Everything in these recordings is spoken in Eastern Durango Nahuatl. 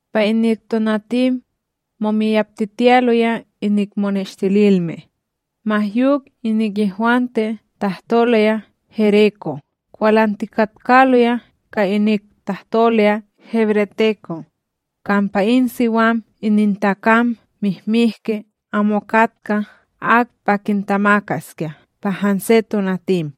Pa inik tonatim, momiyaptitiyaloya inik moneshtililme, ma yok inik yehwante tahtoloya gereko' kwalantikatkaloya ka inik tahtoloya hebreteko', kampa in siwam inintakam mihmihki amo katka ak pa kintamakaskya pa hanse tonatim.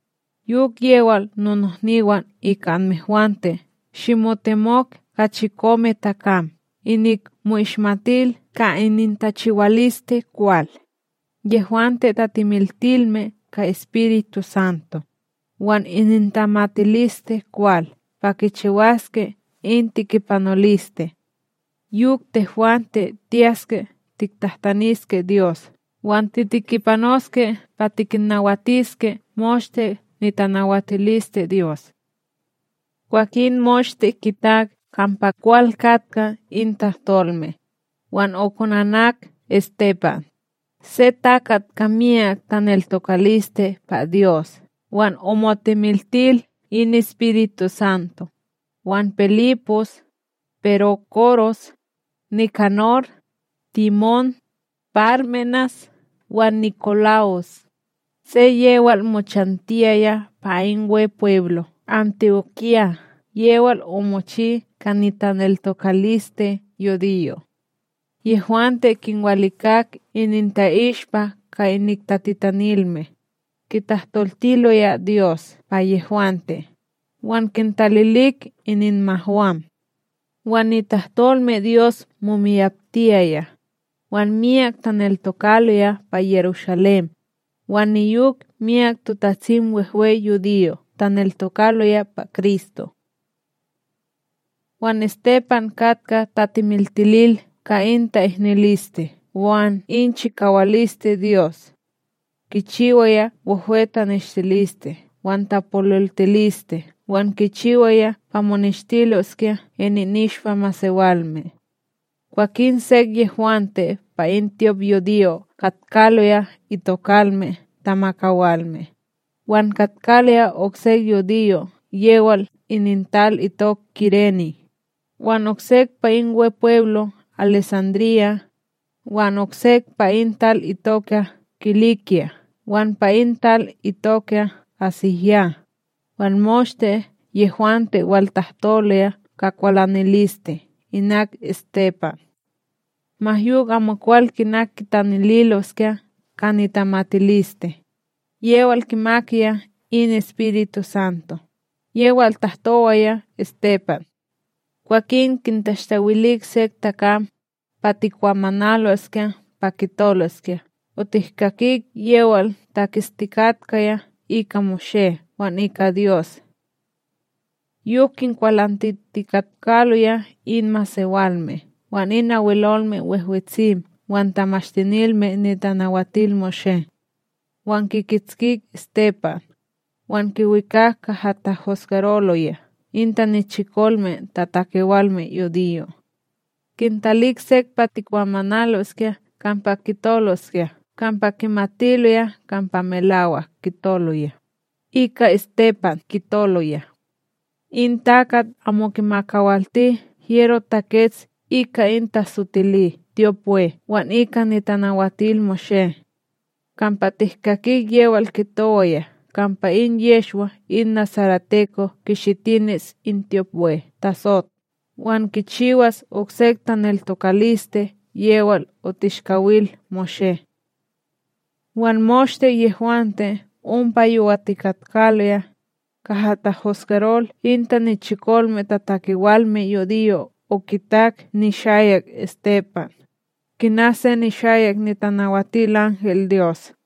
Yok yewal nonohniwan ika anmehwante shimotemok ka chikome takam inik mo'ishmatil ka inintachiwaliste kwal, yehwante tatimiltilme ka EspirituSanto, wan inintamatiliste kwal pa kichiwaske in tekipanoliste. Yok tehwante tiyaske tiktahtaniske Dyos wan titekipanoske pa tikinnawatiske moshte nitanawatiliste Dyos. Kwakin moshte kitak kampa kwal katka in tahtolme, wan okonanak Estepan, se takat ka miyak taneltokaliste pa Dyos wan omotimiltil in EspirituSanto, wan Pilipos, Perókoros, Nikanor, Timón, Pármenas wan NikoLa'os, se yewal mochantiyaya pa in Wepweblo Anti'okya yewal omochi ka nitaneltokaliste yudiyo'. Yehwante kinwalikak ininta'ishpa ka inik tatitanilme, kitahtoltiloya Dyos pa yehwante wan kintalilik ininmahwam. Wan nitahtolmeDyos momiyaptiyaya, wan miyak taneltokaloya pa Yerushalém, wan niyok miyak TotatsimWehwe yudiyo' taneltokaloya pa Kristo. Wan Estepan katka tatimiltilil ka in ta'ihniliste wan in chikawaliste Dyos, kichiwaya wehwe taneshtiliste wan tapololtiliste wan kichiwaya pa moneshtiloskya ininishpa masewalme. Kwakin sek yehwante pa in tyopYudiyo katkaloya itokalme tamakawalme, wan katkaloya oksek yudiyo' yewal inintal itok Kirene, wan oksek pa in Wepweblo Alesandríya, wan oksek pa in tal itoka Kilikya wan pa in tal itoka AsíYah, wan moshte yehwante waltahtoloya ka kwalaniliste inak Estepan; ma yok amokwal kina kitanililoskya ka nitamatiliste, yewal kimakaya in EspirituSanto yewal tahtowaya Estepan. Kwakin kintashtawilik sek takam, pa tikwamanaloskya pa kitoloskya otihkakik yewal taketstikatkaya ika Moshé wan ika Dyos. Yok kinkwalantitikatkaloya in masewalme wan in Abwelolme Wehwetsim wan Tamashtinilme NitanawatilMoshé; wan kikitskik Estepan, wan kiwikak kaha tahosgaroloya in tanichikolme tatakewalme yudiyo'. Kintalik sek pa tikwamanaloskya kampa kitoloskya kampa kimatiloya kampa melawak kitoloya, ika Estepan kitoloya: —In takat amo kimakawalti hyero takets ika in tasotili tyopWe wan ika NitanawatilMoshé. Kampa tihkakik yewal kitowaya kampa in Yehshwa in nasareteko kishitinis in tyopWe tasot wan kichiwas oksek taneltokaliste yewal otishkawil Moshé. Wan moshte yehwante ompa yowatikatkaloya, kaha tahosgarol in tanichikolme tatakewalme yudiyo' okitak nishayak Estepan, kina se nishayak nitanawatilanhelDyos.